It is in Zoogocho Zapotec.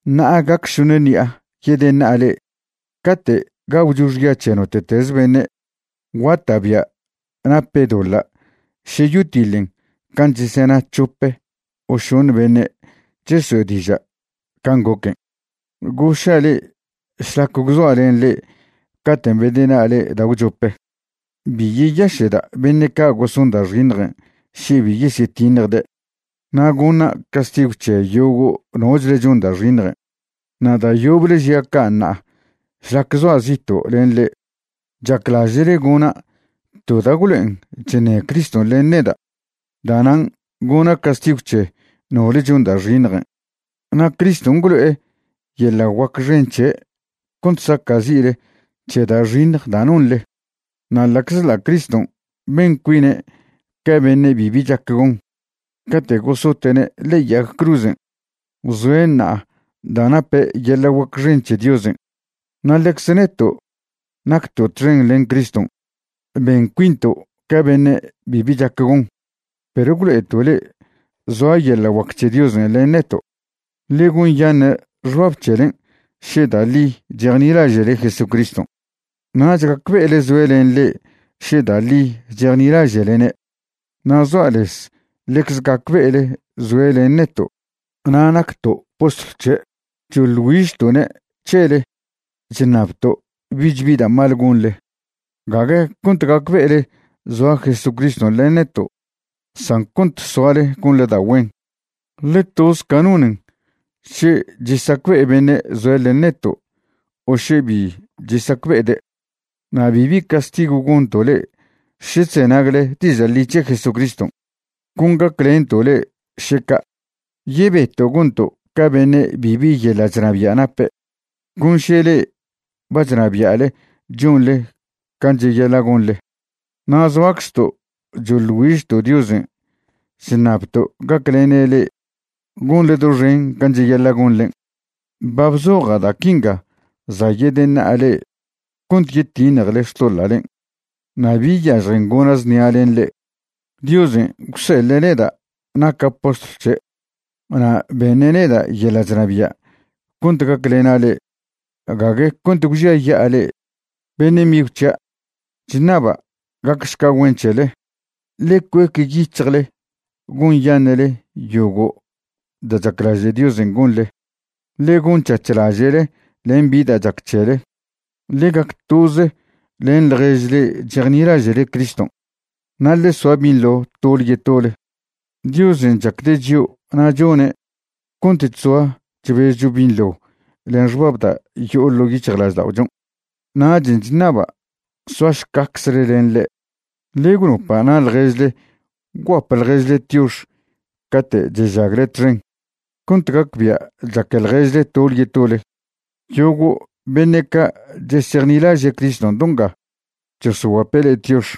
Ṉa'a gac šoṉe ṉi'a yedeṉa'a le'e. Cate' gagwcho xya c̱he note'teze beṉe', guata'bia' nape' doḻa' še yotiḻen can' chesena c̱hope o šoṉe beṉe' cheso'e diža' can' goquen'. Goša' le'e šlac gwzoa' len le'e caten' bedeṉa'a le'e da' gwchope, bi yeyaše'da' beṉe' ca' goson da' xiṉjen' še bi yesyetiṉjde', na' goṉa' castigw c̱he yogo' nochle chon da' xiṉjen'. Na' da' yoble žia' ca' ṉa'a šlac zoa' zito' len le'e. Chaclaže'le gona' to da' gwlo'en chṉe Criston' len neda'. Da'nan' goṉa' castigw c̱he nole chon da' xiṉjen'. Na' Criston' gwlo'e yeḻa' guac xen c̱he' cont saca'zi'le c̱he da' xiṉj da' nonḻe. Na' ḻa'czḻa' Criston' ben cuine' ca beṉe' bibi chac gon cate' gosote'ne' ḻe'e yag cruzen', zoe' ṉa'a da' nape' yeḻa' guac xen c̱he Diosen'. Na' ḻecze neto' nacto' txen len Criston' ben cuinto' ca beṉe' bibi chac gon, perw gwlo'eto' le'e zoa yeḻa' guac c̱he Diosen' len neto'. Ḻe gonyaṉe' xbab c̱helen' še da' ḻi chejnilaže'le Jesucriston'. Nach gacbe'ele zoe' len le'e še da' ḻi chejnilaže'lene'. Na' zoa' lez ḻecze gacbe'ele zoe' len neto' na' nacto' postlw c̱he'. Choḻ güižto'ne' c̱hele chṉabto' bich bi da' mal gonḻe, gague cont gacbe'ele zoa Jesucriston' len neto', san cont soale gonḻe da' güen. Ḻe toze ca nonen še chesacbe'e beṉe' zoe' len neto' o še bi chesacbe'ede'. Na' bibi castigw goṉto' le'e še chzenagle diža' ḻi c̱he Jesucriston', con gaclento' le'e, še ca'. Yebeto' gonto' ca beṉe' bibi yeḻa' chnabia' nape', con še le'e ba chnabia'le chonḻe can' cheyaḻa' gonḻe. Na' zoaczto' choḻ güižto' Diosen' chṉabto' gaclene' le'e gonḻe doxen can' cheyaḻa' gonḻen'. Ba bzoja' da' quinga za' yedeṉa'a le'e cont yetiṉjele xtoḻa'len' na' bi yažjen gona' znia len le'e. Diosen' gwseḻe' neda' naca' postlw c̱he' na' beṉe' neda' yeḻa' chnabia' cont gaclena' le'e, gague cont gwžiaya'a le'e. Beṉe' migw c̱hia', chṉaba' gacšca güen c̱hele. Ḻe cuec yic̱hjle gonyaṉe'le yogo' da' chaclaže' Diosen' gonḻe. Ḻe gon c̱hac̱h laže'le len bi da' chac c̱hele. Ḻe gac toze len ḻjež le'e chejnilaže'le Criston', na' ḻe soa binḻo tole yetole. Diosen' chacde' chio' na' chone' cont chzoa chbezcho binḻo len xbab da' yo'o ḻo' yic̱hjlažda'ochon', nachen' chṉaba' soašcacze' len le'e. Ḻe gwnopa' na' ḻježle gwguap ḻježle tiox cate' chežagle txen, cont gacbia' chaque ḻježle tole yetole. Yogo' beṉe' ca' chesejnilaže' Criston' do nga chosoguape' le'e tiox.